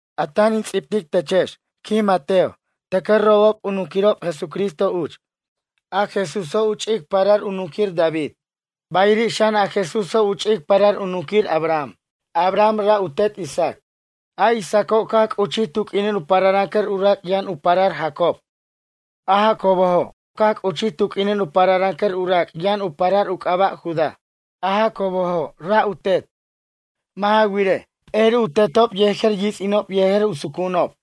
A tan in ts'ibtic techex, quij Mateo, tʌcʌ robob u nunquirob Jesucristo uch. A Jesúso' u ch'ic parar u nunquir David. Bayiri' xan a Jesúso' u ch'ic parar u nunquir Abraham. Abraham ra' u tet Isaac. A Isaaco' caj c'uchij tu q'uinin u pararʌncʌr u rac' yʌn u parar Jacob. A Jacobojo' caj c'uchij tu q'uinin u pararʌncʌr u rac' yʌn u parar u c'aba' Judá. A Jacobojo' ra' u tet. Mʌ' ja wirej, p'eri u tetob yejer yits'inob yejer u sucu'unob.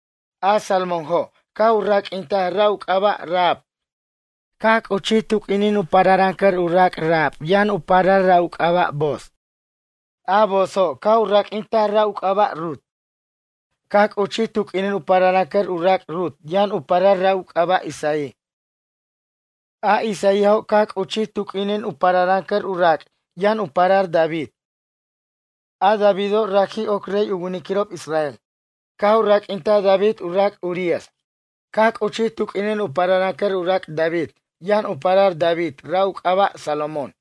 A Salmónjo' caj u raq'uintaj ra' u c'aba' Rahab. Caj c'uchij tu q'uinin u pararʌncʌr u rac' Rahab yʌn u parar ra' u c'aba' Booz. A Boozo' caj u raq'uintaj ra' u c'aba' Rut. Caj c'uchij tu q'uinin u pararʌncʌr u rac' Rut yʌn u parar ra' u c'aba' Isaí. A Isaíajo' caj c'uchij tu q'uinin u pararʌncʌr u rac' yʌn u parar David. A Davido' raji' oc rey u winiquirob israel. Caj u raq'uintaj David u rac' Urías. Caj c'uchij tu q'uinin u pararʌncʌr u rac' David yʌn u parar David ra' u c'aba' Salomón.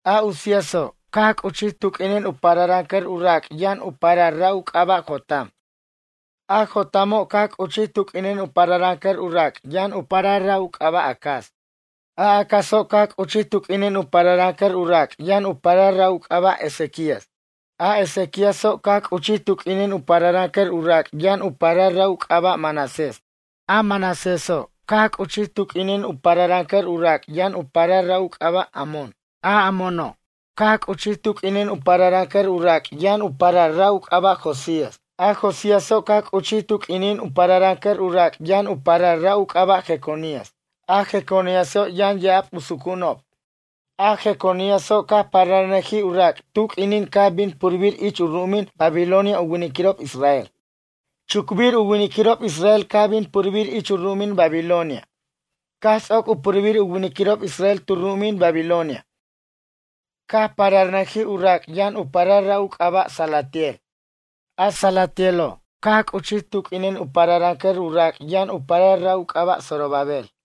A Uzíaso' caj c'uchij tu q'uinin u pararʌncʌr u rac' yʌn u parar ra' u c'aba' Jotam. A Jotamo' caj c'uchij tu q'uinin u pararʌncʌr u rac' yʌn u parar ra' u c'aba' Acaz. A Acazo' caj c'uchij tu q'uinin u pararʌncʌr u rac' yʌn u parar ra' u c'aba' Ezequías. A Ezequíaso' caj c'uchij tu q'uinin u pararʌncʌr u rac' yʌn u parar ra' u c'aba' Manasés. A Manaséso' caj c'uchij tu q'uinin u pararʌncʌr u rac' yʌn u parar ra' u c'aba' Amón. A Amóno' caj c'uchij tu q'uinin u pararʌncʌr u rac' yʌn u parar ra' u c'aba' Josías. A Josíaso' caj c'uchij tu q'uinin u pararʌncʌr u rac' yʌn u parar ra' u c'aba' Jeconías. A Jeconíaso' yʌn ya'ab u sucu'unob. A Jeconíaso' caj pararnʌjij u rac' tu q'uininin caj bin purbir ich u ru'umin Babilonia u winiquirob israel. Chucbir u winiquirob israel caj bin purbir ich u ru'umin Babilonia. Caj ts'oc u purbir u winiquirob israel tu ru'umin Babilonia. Caj pararnʌjij u rac' yʌn u parar ra' u c'aba' Salatiel. A Salatielo' caj c'uchij tu q'uinin u pararʌncʌr u rac' yʌn u parar ra' u c'aba' Zorobabel.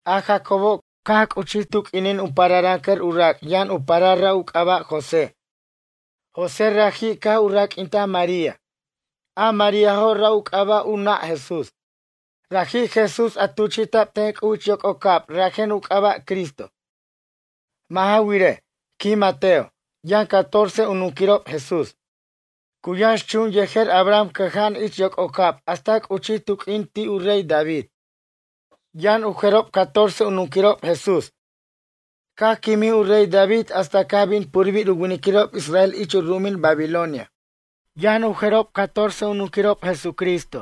A Jacobo' caj c'uchij tu q'uinin u pararʌncʌr u rac' yʌn u parar ra' u c'aba' José. José raji' caj u raq'uintaj María. A Maríajo' ra' u c'aba' u nʌ' Jesús. Raji' Jesús a tuchi'ta'b ten C'uj ich yoc'ocab rajen u c'aba' Cristo. Mʌ' ja wirej, quij Mateo, yʌn catorce u nunquirob Jesús. Cu yʌnx chun yejer Abraham cʌja'an ich yoc'ocab hasta c'uchij tu q'uinin ti' u rey David. Yʌn u jerob catorce u nunquirob Jesús. Caj quimij u rey David hasta caj bin purbir u winiquirob israel ich u ru'umin Babilonia. Yʌn u jerob catorce u nunquirob Jesucristo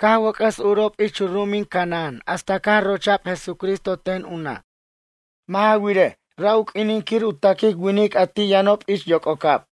caj wʌc'ʌs urob ich u ru'umin Canaán hasta caj rocha'b Jesucristo ten u nʌ'. Mʌ' ja wirej, ra' u q'uinin quir u taquic winic a ti' yʌnob ich yoc'ocab.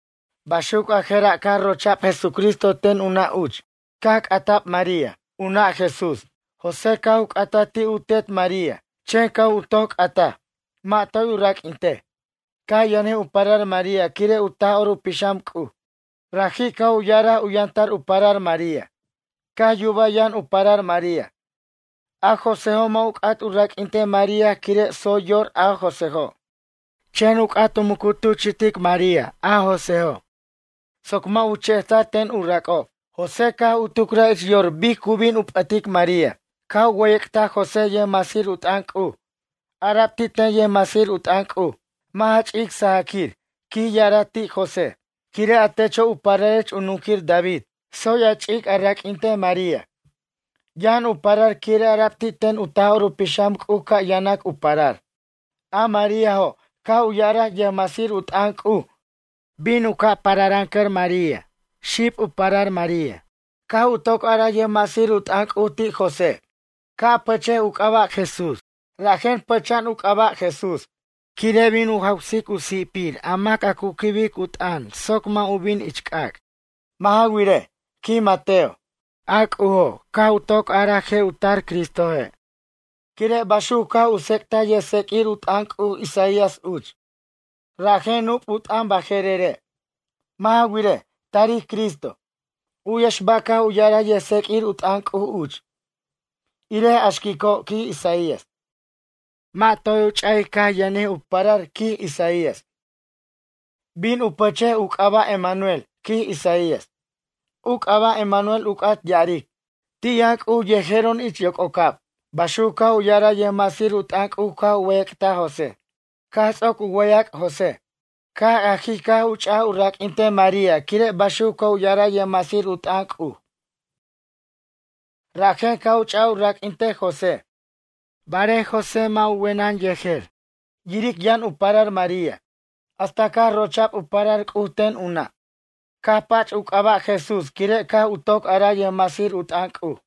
Baxuc a jera' caj rocha'b Jesucristo ten u nʌ' uch. Caj c'ata'b María, u nʌ' Jesús. José caj u c'ata ti' u tet María. Chen caj u toc c'ataj. Mʌ' toy u raq'uintej. Caj yʌnjij u parar María quire' u Taj'or u Pixam C'uj. Raji' caj u ya'araj u yʌntar u parar María. Caj yuba yʌn u parar María. A Joséjo' mʌ' u c'at u raq'uintej María quire' tsoy yor a Joséjo'. Chen u c'at u muc u tuchi'tic María, José, soc mʌ' u che'ta'r ten u rac'ob. José caj u tucraj ich yor bic cu bin u p'ʌtic María. Caj u wʌyʌc'taj José yʌjmasir u t'ʌn C'uj. Ara'b ti' ten yʌjmasir u t'ʌn C'uj: ―Mʌ' ja ch'ic sajaquir ―quij ya'araj ti' José―, quire' a techo' u pararech a nunquir David. Tsoy a ch'ic a raq'uintej María. Yʌn u parar quire' ara'b ti' ten u Taj'or u Pixam C'uj ca' yanac u parar. A Maríajo' ―caj u ya'araj yʌjmasir u t'ʌn C'uj―, bin u ca' pararʌncʌr María xib u parar María. Caj u toc araj yʌjmasir u t'ʌn C'uj ti' José: ―Ca' a pʌchej u c'aba' JESÚS ca' bin a pʌchej u c'aba'. Rajen pʌcha'an u c'aba' Jesús, quire' bin u jawsic u si'pir a mac a cu quibic u t'ʌn soc mʌ' u bin ich c'ac'. Mʌ' ja wirej, quij Mateo, a C'ujo' caj u toc araj je' u tar Cristoje'. Quire' baxuc caj u tsec'taj yʌjtseq'uir u t'ʌn C'uj Isaías uch. Rajen nup' u t'ʌn baje'rere'. Mʌ' ja wirej, tarij Cristo. U'yex ba' caj u ya'araj yʌjtseq'uir u t'ʌn C'uj uch: Irej a xquico' ―quij Isaías: Mʌ' toy u ch'a'i' caj yʌnjij u parar ―quij Isaías―. Bin u pachej u c'aba' Emanuel ―quij Isaías. U c'aba' Emanuel u c'at ya'aric: Ti' yʌn C'uj yejero'on ich yoc'ocab. Baxuc caj u ya'araj yʌjmasir u t'ʌn C'uj caj u wʌyʌc'taj José. Caj ts'oc u wʌyʌc' José. Caj ajij caj u ch'aj u raq'uintej María quire' baxuc caj u ya'araj yʌjmasir u t'ʌn C'uj. Rajen caj u ch'aj u raq'uintej José. Barej José mʌ' u wenʌn yejer, yiric yʌn u parar María, hasta caj rocha'b u parar C'uj ten u nʌ'. Caj pach u c'aba' JESÚS quire' caj u toc araj yʌjmasir u t'ʌn C'uj.